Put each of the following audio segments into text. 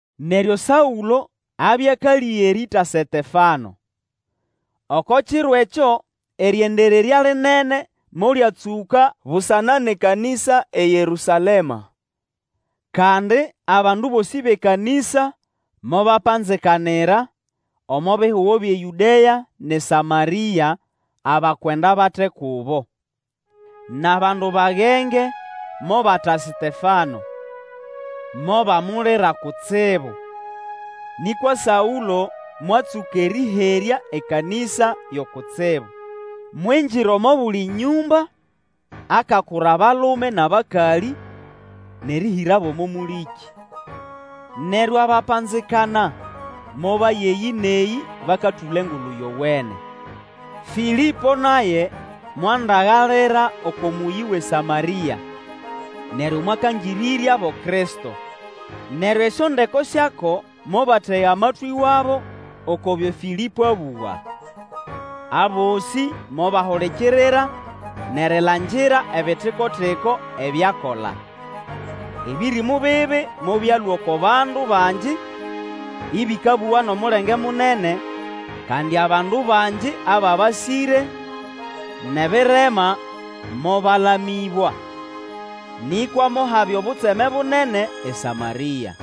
Neryo Saũlo abya akalĩga erĩĩta Setefano. Saũlo akendereraya ekanĩsa Oko kiro ekyo, erĩendererya lĩnene molyatsũka busana nʼekanĩsa eYerũsalema. Kandi abandu bosĩ bʼekanĩsa mobapanzikanira omo bihugo byʼeYũdea nʼeSamarĩa, abakwenda bate kubo. Nʼabandu bagenge mobata Setefano, mobamulira kutsibu. Nĩkwa Saũlo mwatsũka erĩherya ekanĩsa yo kutsibu, mwingira omo buli nyũmba akakura abalume nʼabakalĩ, nʼerĩhĩrabo omo mũlĩkĩ. Neryo abapanzikana mobaya eyĩ nʼeyĩ bakatũla Engulu Yowene. Fĩlĩpo naye mwandagalira oko mũyĩ wʼeSamarĩa, neryo mwakangĩrĩryabo Kristo. Neryo esyondeko syako mobatega matwĩ wabo oko byo Fĩlĩpo abũga. Abosĩ mobahulikirira, nʼerilangira ebitiko-tiko ebyo akola. Ebĩrĩmũ bibi mobyalũa oko bandu bangi ĩbĩkabũga nʼomulenge munene; kandi abandu bangi ababasĩre nʼebirema, mobalamĩbwa. Nĩkwa mohabya obutseme bunene eSamarĩa.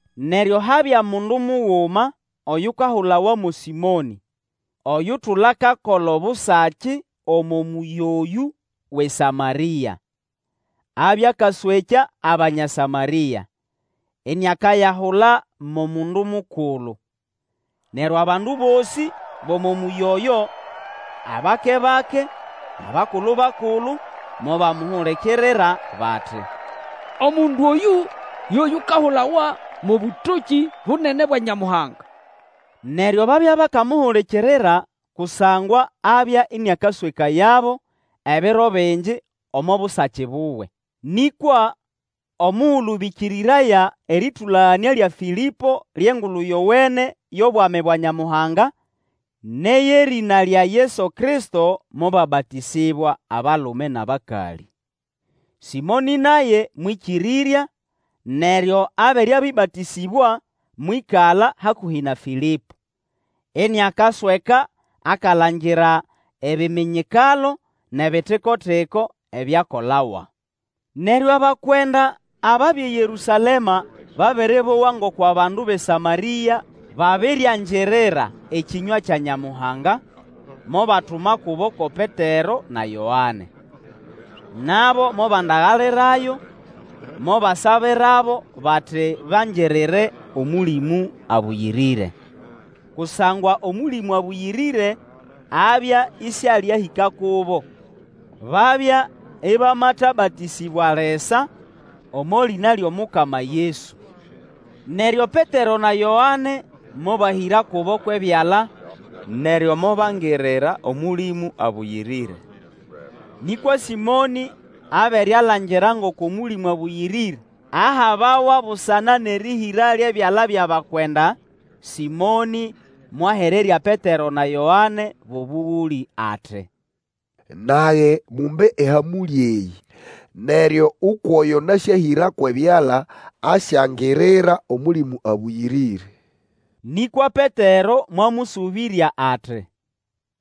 Neryo habya mundu muguma oyukahulawa mo Sĩmonĩ, oyutula akakola obusaki omo mũyĩ oyũ wʼeSamarĩa. Abya akaswekya Abanya Samarĩa, iniakayahula mo mundu mukulu. Neryo abandu bosĩ, bʼomo mũyĩ oyo, abakebake, nʼabakulu-bakulu, mobamuhulikirira bati, Omundu oyũ, yo yukahulawa mo Bũtokĩ Bunene bwa Nyamuhanga. Neryo babya bakamuhulikirira kusangwa abya ĩnĩakaswekayabo ebiro bingi omo busaki buwe. Nĩkwa omugulu bĩkĩrĩraya erĩtũlaganĩa lya Fĩlĩpo lyʼEngulu Yowene yʼobwami bwa Nyamuhanga, nʼeyʼerĩna lya Yesu Kristo, mobabatĩsĩbwa, abalume nʼabakalĩ. Sĩmonĩ naye mwĩkĩrĩrya neryo abere abĩbatĩsĩbwa, mwĩkala hakũhĩ na Fĩlĩpo, iniakasweka akalangira ebiminyikalo, nʼebitiko-tiko ebyakolawa. Neryo abakwenda ababya eYerũsalema babere bowa ngoko abandu bʼeSamarĩa babiriangirira ekĩnywa kya Nyamuhanga, mobatuma kubo ko Petero na Yoane. Nabo mobandagalirayo, mobasabirabo bati bangirire Omũlĩmũ Abũyĩrĩre. Kusangwa Omũlĩmũ Abũyĩrĩre abya ĩsyalĩahĩka kubo. Babya ĩbamatabatĩsĩbwa lisa omo lĩna lyʼomukama Yesu. Neryo Petero na Yoane mobahĩra kubo kwʼebyala, neryo mobangirira Omũlĩmũ Abũyĩrĩre. Nĩkwa Sĩmonĩ abere alangira ngoko Mũlĩmũ Abũyĩrĩre ahabawa busana nʼerĩhĩra lyʼebyala byʼabakwenda, Sĩmonĩ mwahererya Petero na Yoane bʼobũgũlĩ. Ati, Nage, mumbe ehamũlĩ eyĩ, neryo ukwʼoyo nasyahĩra kwʼebyala asyangirira Omũlĩmũ Abũyĩrĩre. Nĩkwa Petero mwamũsũbĩrya ati,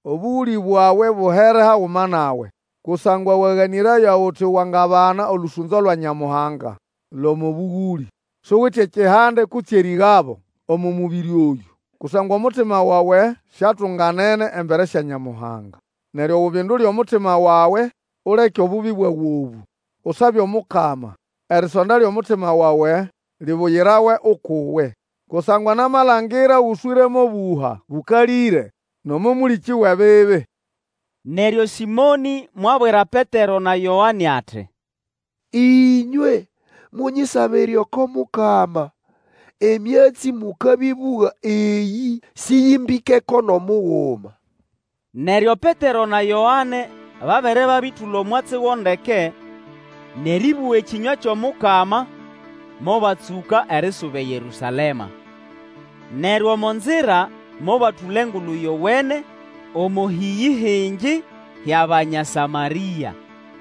Obũgũlĩ bwawe buhere haguma nawe, kusangwa waganĩraya uti wangabana olũsũnzo lwa Nyamuhanga lʼomo bũgũlĩ! Suwite ekihande kutse erĩgabo omo mũbĩrĩ oyũ, kusangwa omutima wawe siatunganene embere sya Nyamuhanga. Neryo ubindule omutima wawe uleke obubi bwawe obũ, usabe Omukama, erisonda lyʼomutima wawe, libuyirawe ukʼuwe. Kusangwa namalangira goswĩre mʼobũha bũkalĩre, nʼomo mũlĩkĩ wʼebibi. Neryo Sĩmonĩ mwabwira Petero na Yoane ati, Ĩnywe munyisabire oko Mukama, emyatsi mũkabĩbũga eyĩ sĩyĩmbĩkeko nʼomuguma. Neryo Petero na Yoane, babere babĩtũla omwatsi go ndeke, nʼerĩbũga ekĩnywa kyʼomukama, mobatsũka erisuba eYerũsalema. Neryo omo nzira mobatũla Engulu Yowene omo hĩyĩ hingi hyʼAbanya Samarĩa.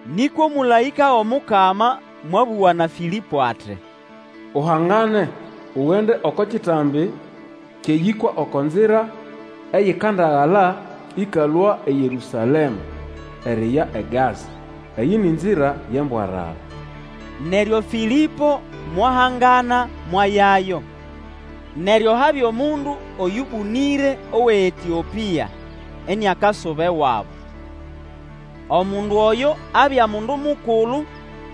Nĩkwa omũlaĩka wʼomukama mwabũga na Fĩlĩpo ati, Uhangane, ugende oko kitambi kyʼeyĩkwa oko nzira eyikandagala ĩkalũa eYerũsalema eriya eGaza. Eyĩ ni nzira yʼembwarara. Neryo Fĩlĩpo mwahangana mwayayo. Neryo habya omundu oyũbũnĩre owʼeEtĩopĩa, iniakasuba ewabo. Omundu oyo abya mundu mukulu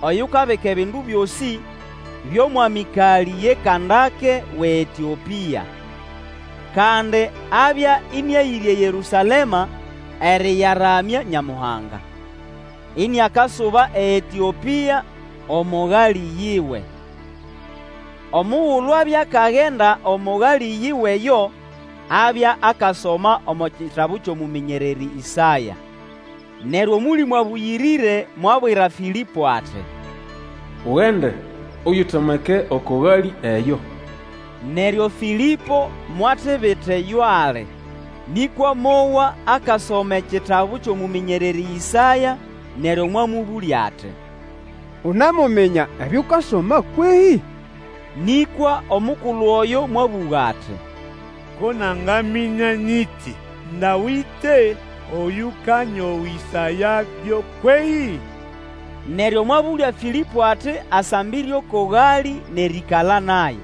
oyukabika ebindu byosĩ byʼomwamikalĩ ye Kandake wʼeEtĩopĩa. Kandi abya ĩnĩayĩre eYerũsalema erĩyaramya Nyamuhanga, iniakasuba eEtĩopĩa omo galĩ yiwe. Omugulu abya akagenda omo galĩ yiwe eyo, abya akasoma omo kitabu kyʼomũmĩnyererĩ Ĩsaya. Neryo Omũlĩmũ Abũyĩrĩre mwabwira Fĩlĩpo ati, Ugende, uyitomeke oko galĩ eyo. Neryo Fĩlĩpo mwatibita eyo ali, nĩkwa mowa akasoma ekitabu kyʼomũmĩnyererĩ Ĩsaya, neryo mwamũbũlya ati, Unemuminya ebyo ukasoma kwehĩ? Nĩkwa omukulu oyo mwabũga ati, Ko nangaminya nyiti ndawite oyũkanyowĩsayabyo kwehĩ? Neryo mwabũlya Fĩlĩpo ati asambire oko galĩ nʼerĩĩkala naye.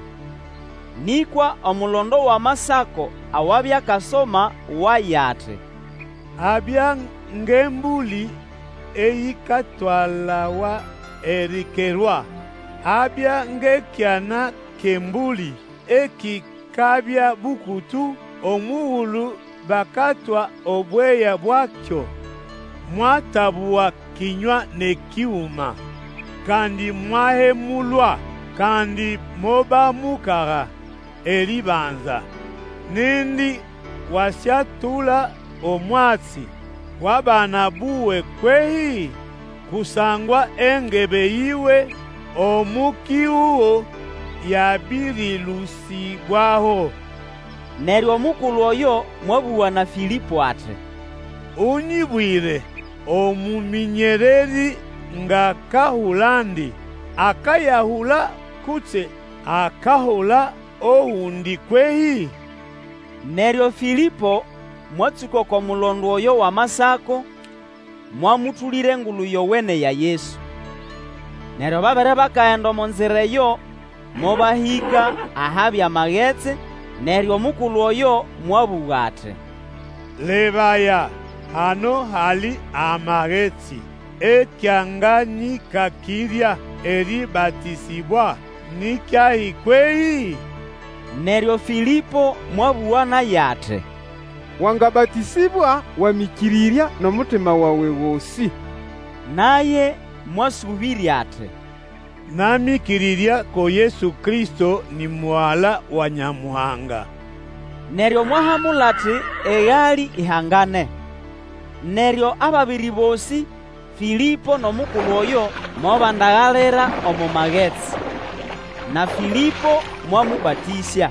Nĩkwa omulondo wʼAmasako awabya akasoma waya, ati, Abya ngʼembũlĩ eyikatwalawa erikerwa, Abya ngʼekyana kyʼembũlĩ ekikabya bũkũtũ omugulu bakatwa obweya bwakyo. Mwatabũga kĩnywa nʼekiguma. Kandi mwahemulwa, kandi mobamukaga erĩbanza. Nindi wasyatũla omwatsi wʼabana buwe kwehĩ? Kusangwa engebe yiwe omo kihugo yabĩrĩlũsĩbwaho. Neryo omukulu oyo mwabũga na Fĩlĩpo ati, Unyibwire omũmĩnyererĩ ngʼakahulandi. Akayahula kutse akahula ogundi kwehĩ? Neryo Fĩlĩpo mwatsũka oko mulondo oyo wʼAmasako, mwamũtũlĩra Engulu Yowene ya Yesu. Neryo babere bakagenda omo nzira eyo, mobahĩka ahabya magetsi, neryo omukulu oyo mwabũga ati, Lebaya, hano hali amagetsi! Ekyanganyĩkakĩrya erĩbatĩsĩbwa ni kyahi kwehĩ? [ Neryo Fĩlĩpo mwabũga naye ati, Wangahatĩsĩbwa Wamĩkĩrĩrya nʼomutima wawe gosĩ. Naye mwasũbirya ati, Namĩkĩrĩrya ko Yesu Kristo ni Mugala wa Nyamuhanga.] Neryo mwahamula ati egalĩ ihangane, neryo ababiri bosĩ, Fĩlĩpo nʼomukulu oyo, mobandagalira omo magetsi, na Fĩlĩpo mwamũbatĩsya.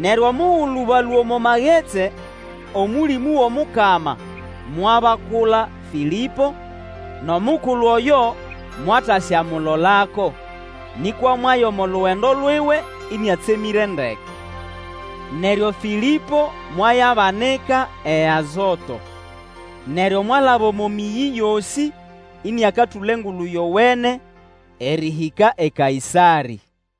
Neryo omugulu balũa omo magetsi, Omũlĩmũ wʼomukama mwabakula Fĩlĩpo, nʼomukulu oyo mwataswamulolako, nĩkwa mwaya omo lugendo luwe ĩnĩatsemĩre ndeke. Neryo Fĩlĩpo mwayabanika eAzoto. Neryo mwalaba omo mĩyĩ yosĩ ĩnĩakatũla Engulu Yowene, erĩhĩka e Kaĩsarĩ.